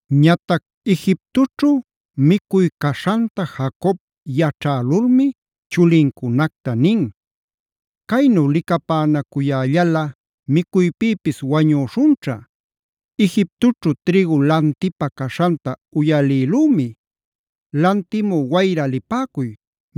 Ñatac Egiptoćhu micuy caśhanta Jacob yaćhälulmi chulincunacta nin: “¿¡Caynu licapänacuyällalꞌa micuypïpis wañüśhunćha!? Egiptoćhu trïgu lantipä caśhanta uyalïlümi. Lantimü wayra lipäcuy,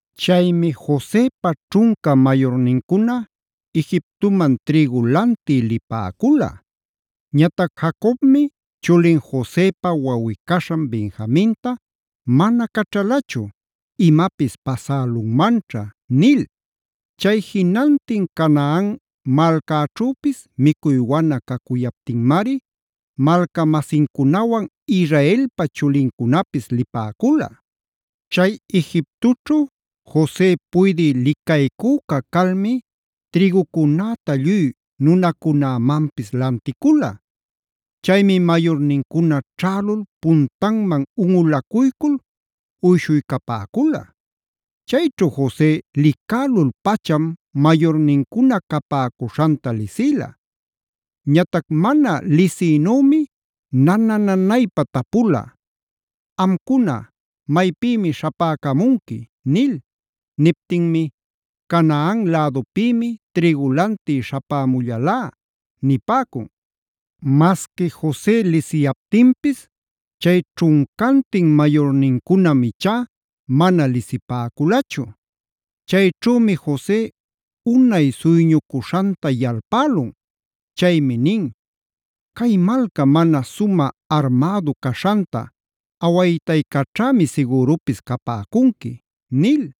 Chaymi Josepa ćhunca mayurnincuna Egiptoman trïgu lantï lipäcula. Ñatac Jacobmi chulin Josepa wawꞌi-caśhan Benjaminta mana caćhalachu “imapis pasälunmanćha” nil. Chay jinantin Canaan malcäćhüpis micuy wana cacuyaptinmari malca-masincunawan Israelpa chulincunapis lipäcula. Chay Egiptoćhu Jose puydï licaycüca calmi trïgucunäta lluy nunacunämanpis lanticula. Chaymi mayurnincuna ćhälul puntanman unꞌulacuycul uyshuycapäcula. Chayćhu Jose licälul-pacham mayurnincuna capäcuśhanta lisïla. Ñatac mana lisïnümi nana-nanaypa tapula: “¿¡Amcuna, maypïmi śhapäcamunqui!?” nil. Niptinmi: “Canaan lädupïmi trïgu lantï śhapämullalá” nipäcun. Masqui Jose lisiyaptinpis chay ćhuncantin mayurnincunam ichá mana lisipäculachu. Chayćhümi Jose unay suyñucuśhanta yalpälun.b Chaymi nin: “¿Cay malca mana sumä armädu caśhanta awaytaycaćhämi sigürupis capäcunqui?” nil.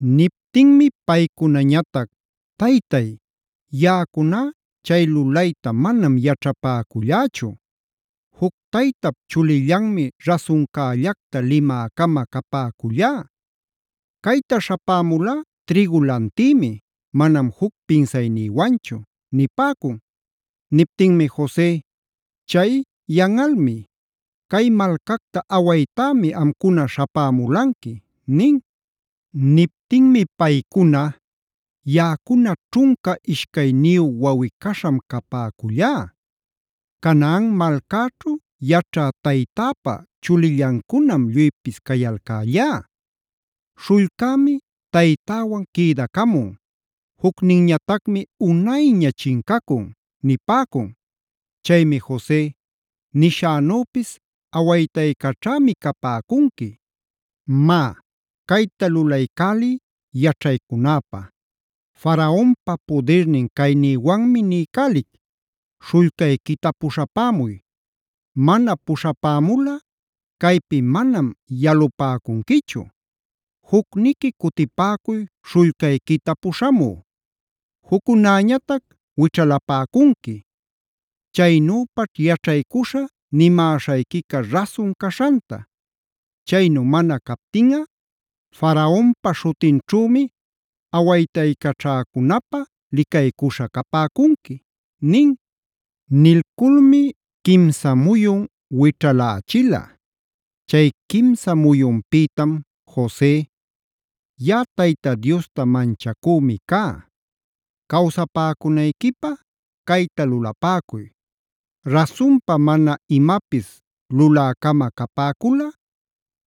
Niptinmi paycunañatac: “Taytay, yaꞌacuná chay lulayta manam yaćhapäcullächu. Juc taytap chulillanmi rasuncällacta limä-cama capäcullá. Cayta śhapämulá trïgu lantïmi, manam juc pinsaynïwanchu” nipäcun. Niptinmi Jose: “Chay, yanꞌalmi. Cay malcacta awaytämi amcuna śhapämulanqui” nin. Niptinmi paycuna: “Yaꞌacuna ćhunca ishcayniyu wawꞌi-caśham capäcüllá. Canaan malcäćhu yaćha taytäpa chulillancunam lluypis cayalcällá. Śhullcämi taytäwan quïdacamun, jucninñatacmi unayña chincacun” nipäcun. Chaymi Jose: “Nishänüpis awaytaycaćhämi capäcunqui. Má, cayta lulaycäliy yaćhaycunäpä: Faraonpa pudirnin caynïwanmi niycälic, śhullcayquita puśhapämuy. Mana puśhapämulꞌa caypi manam yalupäcunquichu. Jucniqui cutipäcuy śhullcayquita puśhamü, juccunäñatac wićhalapäcunqui. Chaynüpaćh yaćhaycuśhä nimäśhayquica rasun caśhanta. Chaynu mana captinꞌa Faraonpa śhutinćhümi awaytaycaćhäcunapä licaycuśha capäcunqui” nin. Nilculmi quimsa muyun wićhalächila. Chay quimsa muyunpïtam Jose: “Yaꞌa Tayta Diosta manchacümi cá. Cawsapäcunayquipä cayta lulapäcuy: Rasunpa mana imapis lulä-cama capäculꞌa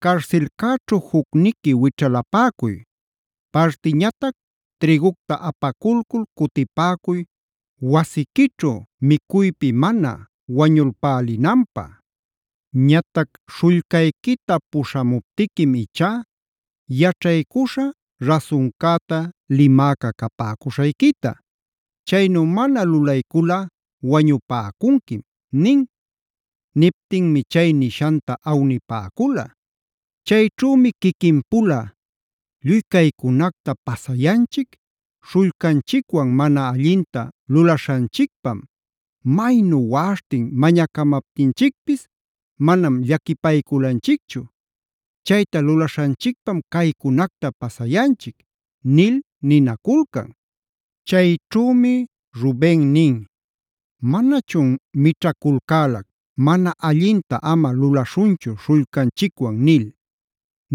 carsilcäćhu jucniqui wićhalapäcuy. Partiñatac trïgucta apaculcul cutipäcuy wasiquićhu micuypi mana wañulpälinanpä. Ñatac śhullcayquita puśhamuptiquim ichá yaćhaycuśhä rasuncäta limäca capäcuśhayquita. Chaynu mana lulayculꞌa wañupäcunquim” nin. Niptinmi chay nishanta awnipäcula. Chayćhümi quiquinpula: “Lluy caycunacta pasayanchic śhullcanchicwan mana allinta lulaśhanchicpam. Maynu waꞌaśhtin mañacamaptinchicpis manam llaquipayculanchicchu. Chayta lulaśhanchicpam caycunacta pasayanchic” nil ninaculcan. Chayćhümi Ruben nin: “Manachun mićhaculcälac: ‘Mana allinta ama lulaśhunchu śhullcanchicwan’ nil.c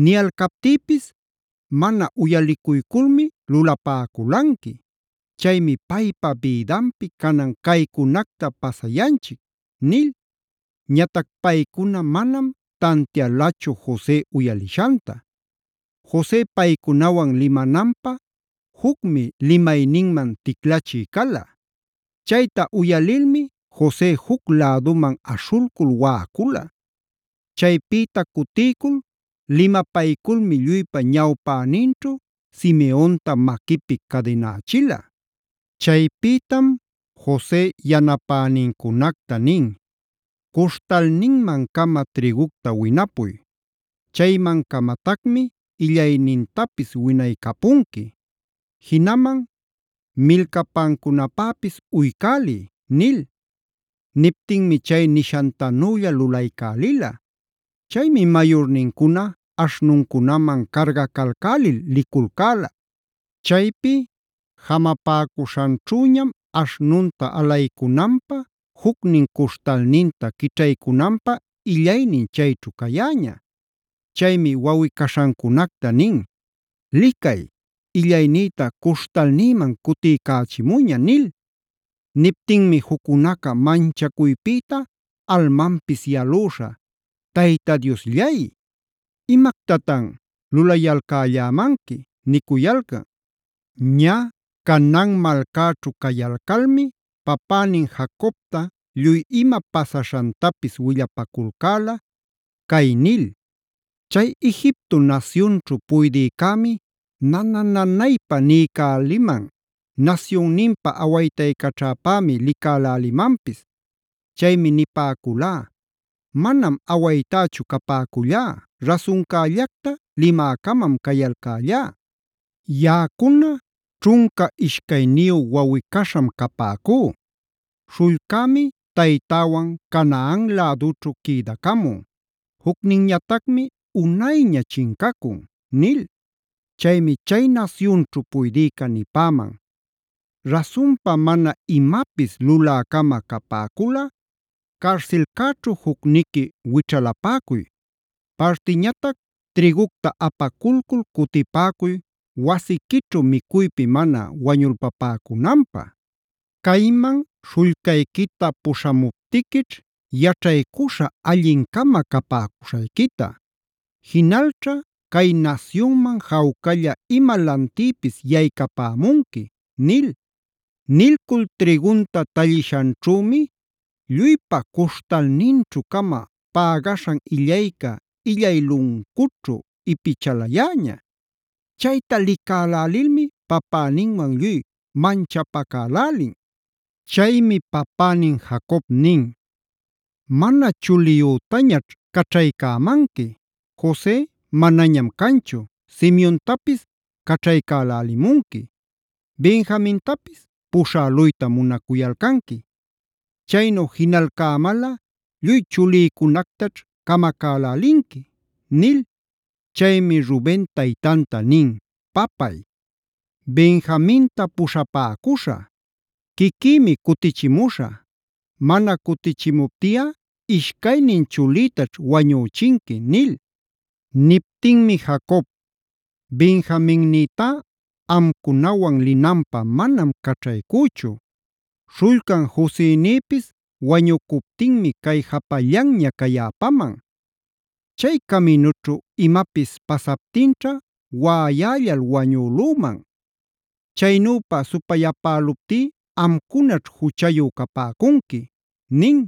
Niyalcaptïpis mana uyalicuyculmi lulapäculanqui. Chaymi paypa bïdanpi canan caycunacta pasayanchic” nil. Ñatac paycuna manam tantialachu Jose uyaliśhanta. Jose paycunawan limananpä jucmi limayninman ticlachï cala. Chayta uyalilmi Jose juc läduman aśhulcul waꞌacula. Chaypïta cutiycul limapayculmi lluypa ñawpäninćhu Simeonta maquipi cadinächila. Chaypïtam Jose yanapänincunacta nin: “Cuśhtalninman-cama trïgucta winapuy. Chayman-camatacmi illaynintapis winaycapunqui. Jinaman milcapancunapäpis uycäliy” nil. Niptinmi chay nishantanülla lulaycälila. Chaymi mayurnincuna aśhnuncunaman cargacalcälil liculcäla. Chaypi jamapacuśhanćhüñam aśhnunta alaycunanpä jucnin cuśhtalninta quićhaycunanpä illaynin chayćhu cayäña. Chaymi wawꞌi-caśhancunacta nin: “¡Licay, illaynïta cuśhtalnïman cutiycächimuña!” nil. Niptinmi juccunaca manchacuypïta almanpis yalüśha: “Tayta Diosllay, imactatan lulayalcällämanqui” nicuyalcan. Ñä Canaan malcäćhu cayalcalmi papänin Jacobta lluy ima pasaśhantapis willapaculcäla, cay nil: “Chay Egipto nasyunćhu puydïcämi nana-nanaypa niycäliman; nasyunninpa awaytaycaćhäpämi licälälimanpis. Chaymi nipäculá: ‘Manam awaytächu capäcüllá, rasuncällacta limä-camam cayalcällá. Yaꞌacuna ćhunca ishcayniyu wawꞌi-caśham capäcú. Śhullcämi taytäwan Canaan lädućhu quïdacamun, jucninñatacmi unayña chincacun’ nil. “Chaymi chay nasyunćhu puydïca nipäman: ‘Rasunpa mana imapis lulä-cama capäculꞌa, carsilcäćhu jucniqui wićhalapäcuy. Partiñatac trïgucta apaculcul cutipäcuy wasiquićhu micuypi mana wañulpapäcunanpä. Cayman śhullcayquita puśhamuptiquićh yaćhaycuśhä allin-cama capäcuśhayquita. Jinalćha cay nasyunman jawcalla ima lantïpis yaycapämunqui’” nil. Nilcul trïgunta talliśhanćhümi lluypa cuśhtalninćhu-cama pägaśhan illayca illay luncućhu ipichalayäña. Chayta licälälilmi papäninwan lluy manchapacälälin. Chaymi papänin Jacob nin: “Mana chuliyütañaćh caćhaycämanqui, Jose manañam canchu, Simeontapis caćhaycälälimunqui, Benjamintapis puśhäluyta munacuyalcanqui. ¡Chaynu jinalcämalꞌa lluy chulïcunactaćh camacälälinqui!” nil. Chaymi Ruben taytanta nin: “Papay, Benjaminta puśhapäcuśhä; quiquïmi cutichimuśhä. Mana cutichimuptiꞌa ishcaynin chulïtaćh wañüchinqui” nil. Niptinmi Jacob: “Benjaminnïtá amcunawan linanpä manam caćhaycüchu. Śhullcan Josenïpis wañucuptinmi cay japallanña cayäpaman. Chay caminućhu imapis pasaptinćha waꞌayällal wañülüman. Chaynüpa supayapäluptí amcunaćh juchayu capäcunqui” nin.